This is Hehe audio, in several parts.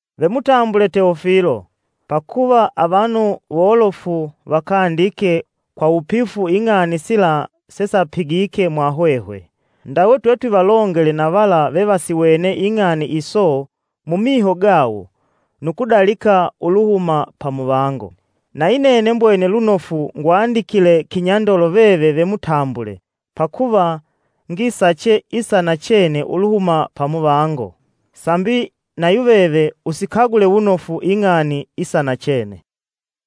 Ve mutambule Teofilo: pakuva avanu wolofu vakandike kwa wupifu ing'ani sila sesapigike mwahwehwe. Ndawe twetwivalongele na vala vevasiwene ing'ani iso mumiho gawo nu kudalika uluhuma pamuvango. Nayi nene mbwene lunofu ngwandikile kinyandolo veve ve mutambule pakuva ngisache isa nachene uluhuma pa muvango. Sambi na yuveve usikagule wunofu ing'ani isanachene.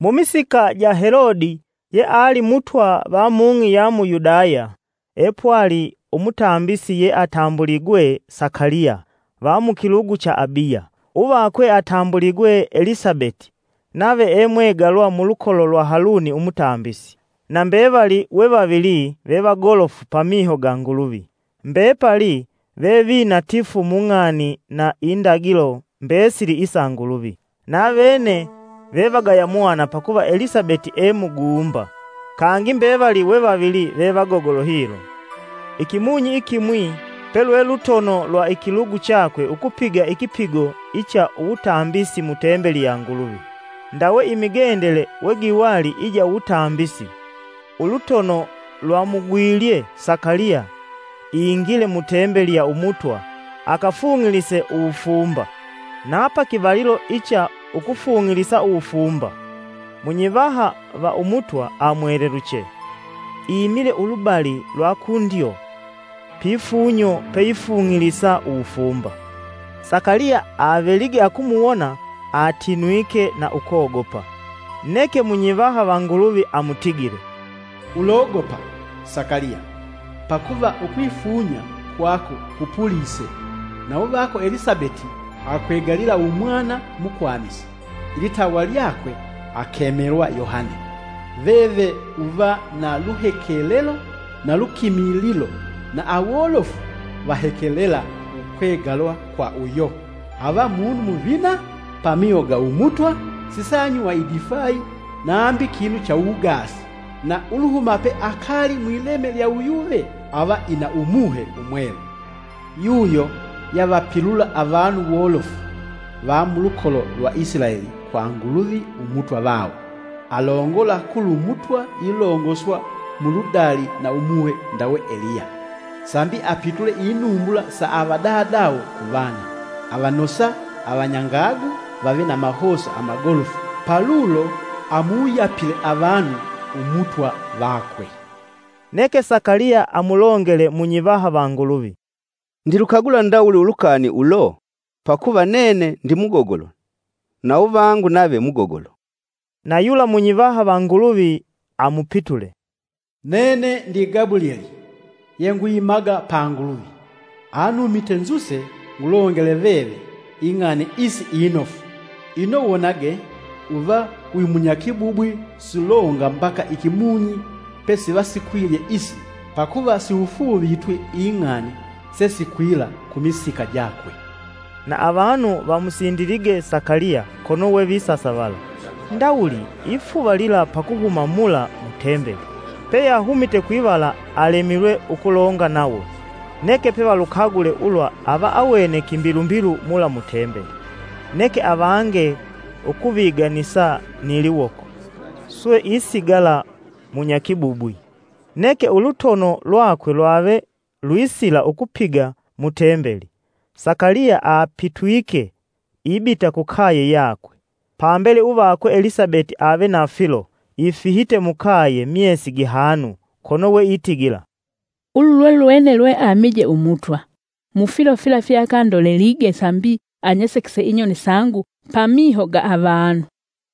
Mumisika ja Helodi yeali Mutwa va mung'i ya mu Yudaya epwali umutambisi yeatambuligwe Sakaliya va mukilugu cha Abiya. Uvakwe atambuligwe Elisabeti nave emwegalwa mulukolo lwa Haluni umutambisi. Na mbevali we vavili vevagolofu pamiho ga Nguluvi, mbepali ve vinatifu mung'ani na indagilo mbesili isa Nguluvi. Navene vevagaya mwana pakuva Elisabeti e muguumba, kangi mbevali we vavili vevagogolo hilo. Ikimunyi ikimwi, pelwe lutono lwa ikilugu chakwe ukupiga ikipigo icha uwutambisi mu tembeli ya Nguluvi. Ndawe imigendele wegiwali ija uwutambisi, ulutono lwamugwilye Sakaliya ingile mutembeli ya Umutwa akafung'ilise uwufumba. Na pakivalilo icha ukufung'ilisa uwufumba. Munyivaha va Umutwa amweleluche, imile ulubali lwa kundyo pifunyo peifung'ilisa uwufumba. Sakaliya avelige akumuwona atinwike na ukogopa. Neke munyivaha va Nguluvi amutigile, “Ulogopa, Sakaliya, pakuva ukwifunya ukusuka kwako kupulise na uvako Elisabeti akwegalila Umwana mukwamisi, ilitawa lyakwe akemelwa Yohane. Veve uva na luhekelelo na lukimililo na awolofu vahekelela ukwegalwa kwa uyo. Ava munu muvina pamiho ga Umutwa sisaanywa idifayi nambi kinu cha uwugaasi. Na uluhuma pe akali mwileme lya uyuve ava ina Umuhe Umwelu. Yuyo yavapilula avanu wolofu va mulukolo lwa Isilaeli kwa Nguluvi Umutwa vawo. Alongola kulu Mutwa ilongoswa mu ludali na umuhe ndawe Eliya. Sambi apitule inumbula sa avadadawo kuvana, avanosa avanyangagu vave na mahosa amagolofu paulo amuwuyapile avanu Umutwa vakwe.” Neke Sakaliya amulongele munyivaha va Nguluvi, “Ndilukagula ndawuli ulukani ulo? Pakuva nene ndimugogolo na uvangu nave mugogolo.” Na yula munyivaha va Nguluvi amupitule, “Nene ndi Gabulyeli yengwimaga pa Nguluvi, anumite nzuse ngulongele veve ing'ani isi inofu. Ino wonage, uva wimunyakibubwi sulonga mbaka ikimunyi pesivasikwilye isi pakuva siufuuvitwi ing'ani sesikwila kumisika jakwe.” Na avanu vamusindilige Sakaliya kono we visasavala ndawuli ifuvalila pa kuhuma mula mu tembeli. Peyahumite kwivala alemilwe ukulonga nawo. Neke pevalukagule ulwa ava awene kimbilumbilu mula mu tembeli. Neke avange ukuviganisa ni liwoko, swe isigala munyakibubwi. Neke ulutono lwakwe lwave lwisila ukupiga mu Tembeli, Sakaliya apitwike ibita kukaye yakwe. Pambele uvakwe Elisabeti ave na filo ifihite mukaye myesi gihanu, kono we itigila, “Ulu lwe lwene lweamije Umutwa: mu filo fila fyeakandolelige sambi anyesekese inyoni sangu: pamiho ga avanu.”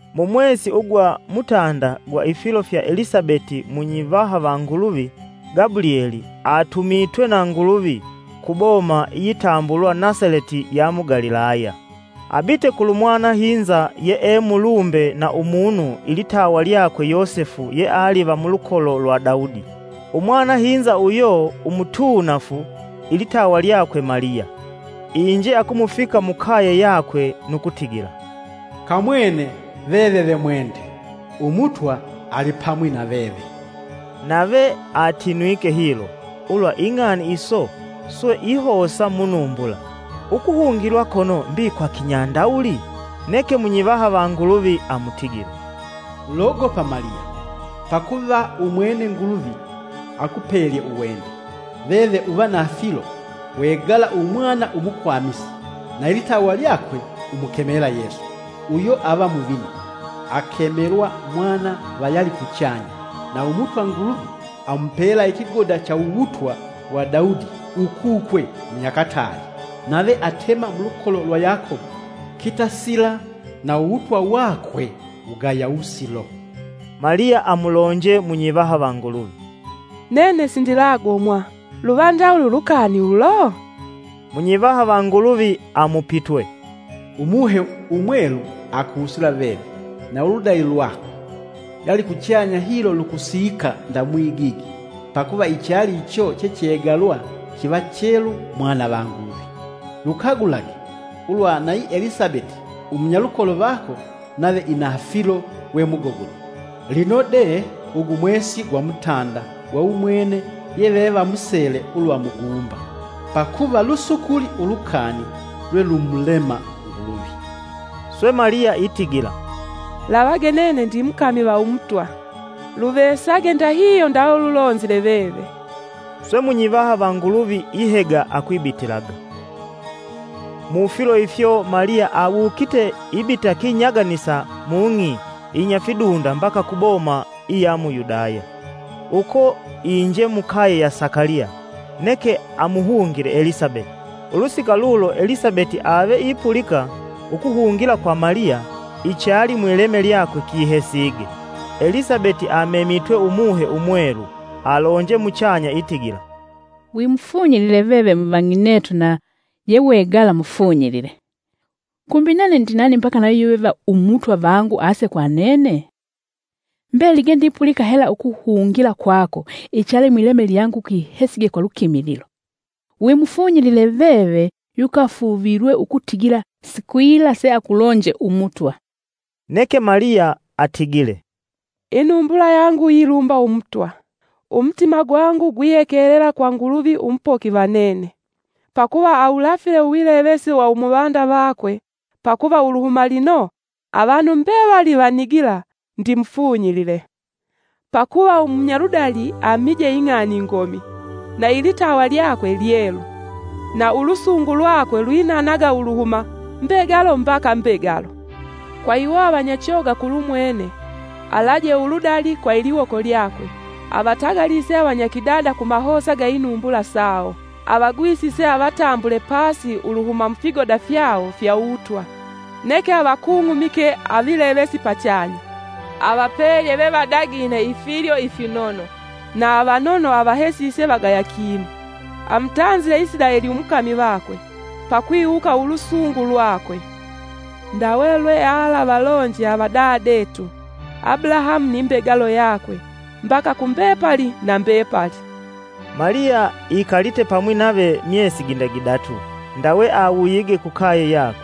Mu mwesi ugwa mutanda gwa ifilo fya Elisabeti munyivaha va Nguluvi Gabulyeli atumitwe na Nguluvi ku boma iyitambulwa Nasaleti ya mu Galilaya, abite kulu mwanahinza yee mulumbe na umunu ilitawa lyakwe Yosefu yeali va mulukolo lwa Daudi, umwanahinza uyo umutuunafu ilitawa lyakwe Maliya. Inje akumufika mukaye yakwe nu kutigila, “Kamwene, veve ve mwende, Umutwa alipamwi na veve!” Nave atinwike hilo, ulwa ing'ani iso swe ihosa munumbula, ukuhungilwa kono mbi kwa kinyandawuli? Neke munyivaha va Nguluvi amutigile, “Ulogopa Maliya, pakuva umwene Nguluvi akupelye uwende. Veve uva na filo wegala umwana umukwamisi na ilitawa lyakwe umukemela Yesu. Uyo ava muvina, akemelwa mwana va yalikuchanya, na Umutwa Nguluvi amupela ikigoda cha uwutwa wa Daudi ukukwe munyakataali. Nave atema mulukolo lwa Yakobo kitasila na uwutwa wakwe wugaya wusilo!” Maliya amulonje munyivaha va Nguluvi, “Nene sindilagomwa luva ndawuli ulukani ulo?” Munyivaha va Nguluvi amupitwe, “Umuhe Umwelu, akusila veve na uludali lwakwe, yalikuchanya hilo lukusiika nda mwigigi, pakuva ichali icho chechegalwa kiva chelu mwana va Nguluvi. Lukagulage ulwa nayi Elisabeti umunyalukolo vako nave ina filo we mugogolo, lino de ugu mwesi gwa mutanda gwa umwene yevevamusele ulwa muguumba. Pakuva lusukuli ulukani lwe lumulema Nguluvi.” Swe Maliya itigila, “Lavage nene ndimukami va Umutwa, luvesage ndahihyo ndawe wulonzile veve.” Swe munyivaha va Nguluvi ihega akwibitilaga. Mufilo ifyo Maliya awukite ibita kinyaganisa mung'i inyafidunda mbaka ku boma iya mu Yudaya. Uko inje mukaye ya Sakaliya, neke amuhungile Elisabeti. Ulusika lulo Elisabeti ave ipulika ukuhungila kwa Maliya, ichali mwileme lyakwe, kihesige; Elisabeti amemitwe Umuhe umwelu, alonje muchanya itigila' “Wimufunyilile veve muvang'inetu na yewegala mufunyilile. Kumbi nene ndi nani mbaka na yuyuve va Umutwa vangu ase kwa nene? Mbelige ndipulika hela ukuhungila kwako, ichali mwileme lyangu kihesige kwa lukimililo. Wimufunyilile veve yukafuuvilwe ukutigila sikwila seakulonje Umutwa.” Neke Maliya atigile, “Inumbula yangu yilumba Umutwa, umutima gwangu gwihekelela kwa Nguluvi Umupoki va nene. Pakuva awulafile uwilevesi wa umuvanda vakwe pakuva uluhuma lino avanu mbevali vanigila ndimufunyilile. Pakuva umunyaludali amije ing'ani ingomi, na ilitawa lyakwe lyelu. Na ulusungu lwake lwinanaga uluhuma, mbegalo mbaka mbegalo. Kwa iwo avanyachoga kulumwene alaje uludali kwa iliwoko lyakwe: avatagalise avanyakidada kumahosa ga inumbula sawo. Avagwisise avatambule pasi uluhuma mufigoda fyawo fya uwutwa, neke avakung'umike avilevesi pachanya. Avapelye ve vadagine ifilyo ifinono, na avanono avahesise vagaya kinu. Amutanzile Isilaeli umukami vakwe, pakwiwuka ulusungu lwakwe. Ndawe lwealavalonje avadadetu, Abulahamu ni mbegalo yakwe mbaka kumbepali na mbepali!” Maliya ikalite pamwi nave myesi ginda gidatu, ndawe awuyige kukaye yakwe.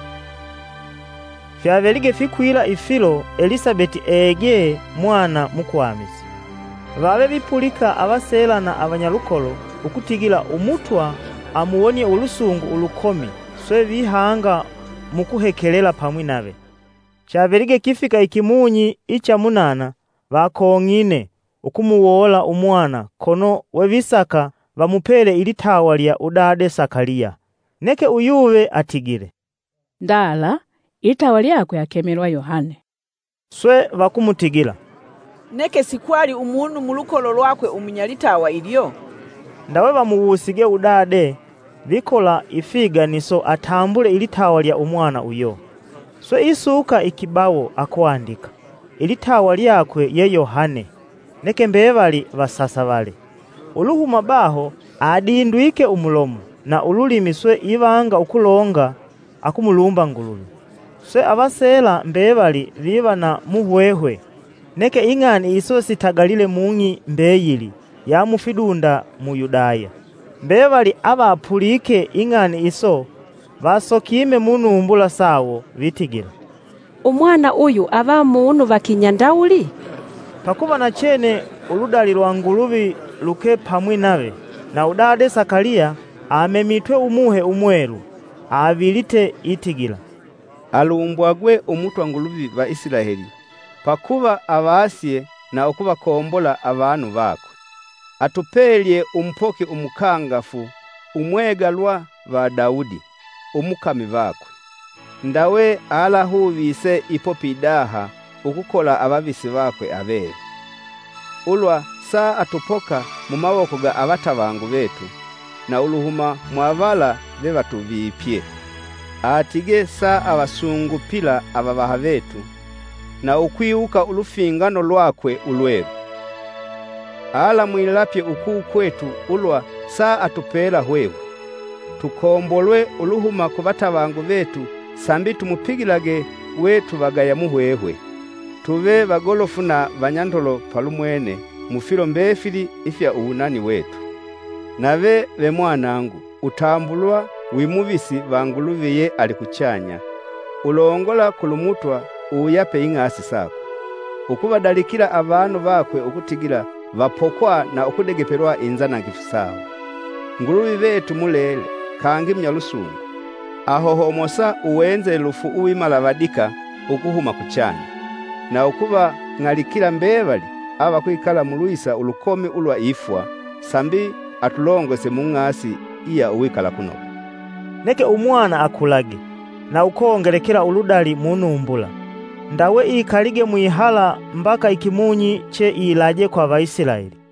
Fyavelige fikwila ifilo Elisabeti egee mwana mukwamisi. Vave vipulika avaseela na avanyalukolo ukutigila Umutwa amuwonie ulusungu ulukomi swe vihanga mukuhekelela pamwi nave. Chavelige kifika ikimunyi icha munana vakong'ine ukumuwoola umwana kono wevisaka vamupele ilitawa lya udade Sakaliya. Neke uyuve atigile, “ndala, ilitawa lyakwe akemwelwa Yohane.” Swe vakumutigila, “Neke sikwali umunu mulukolo lwakwe umunyalitawa ilyo?” Ndawe vamuwusige udade vikola ifiganiso atambule ilitawa lya Umwana uyo. Swe isuka ikibawo akwandika, “Ilitawa lyakwe ye Yohane.” Neke mbevali vasasavale. Uluhuma baho adindwike umulomo na ululimi swe ivanga ukulonga akumulumba Nguluvi. Swe avaseela mbevali viva na muhwehwe, neke ing'ani iso sitagalile mung'i mbeyili ya mufidunda mu Yudaya. Mbevali avapulike ing'ani iso vasokime munumbula sawo vitigila, “Umwana uyu ava munu va kinyandawuli?” Pakuva nachene uludali lwa Nguluvi luke pamwi nave. Na udade Sakaliya, amemitwe Umuhe Umwelu, avilite itigila: “Alumbwagwe Umutwa Nguluvi va Isilaeli, pakuva avasye na ukuvakombola avanu vakwe, Atupelye umupoki umukangafu, umwegalwa va Daudi, umukami vakwe. Ndawe alahuvise ipo pidaha ukukola avavisi vakwe avelu, Ulwa saatupoka mumawoko ga avatavangu vetu, na uluhuma mwavala vevatuvipye. Atigee saavasungupila avavaha vetu, na ukwiwuka ulufingano lwakwe ulwelu. Alamwilapye ukukwetu, ulwa saatupela hwehwe. Tukombolwe uluhuma kuvatavangu vetu sambi tumupigilage we tuvagaya muhwehwe. Tuve vagolofu na vanyandolo palumwene, mufilo mbefili ifya uwunani wetu. Nave ve mwanangu, utambulwa: wimuvisi va Nguluvi ye alikuchanya, ulongola kulu mutwa uwuyape ing'asi sakwe. ukuvadalikila avanu vakwe ukutigila vapokwa na ukudegepelwa inzanangifu sawo. Nguluvi vetu mulele kangi munyalusungu. Ahohomosa uwenzelufu uwimalavadika ukuhuma kuchanya. Na ukuvang'alikila mbevali avakwikala mulwisa ulukomi ulwa ifwa, sambi atulongose mung'asi iya uwikalakunoga.” Neke Umwana akulage, na ukongelekela uludali munumbula. Ndawe ikalige mwihala mbaka ikimunyi che ilaje kwa Vaisilaeli.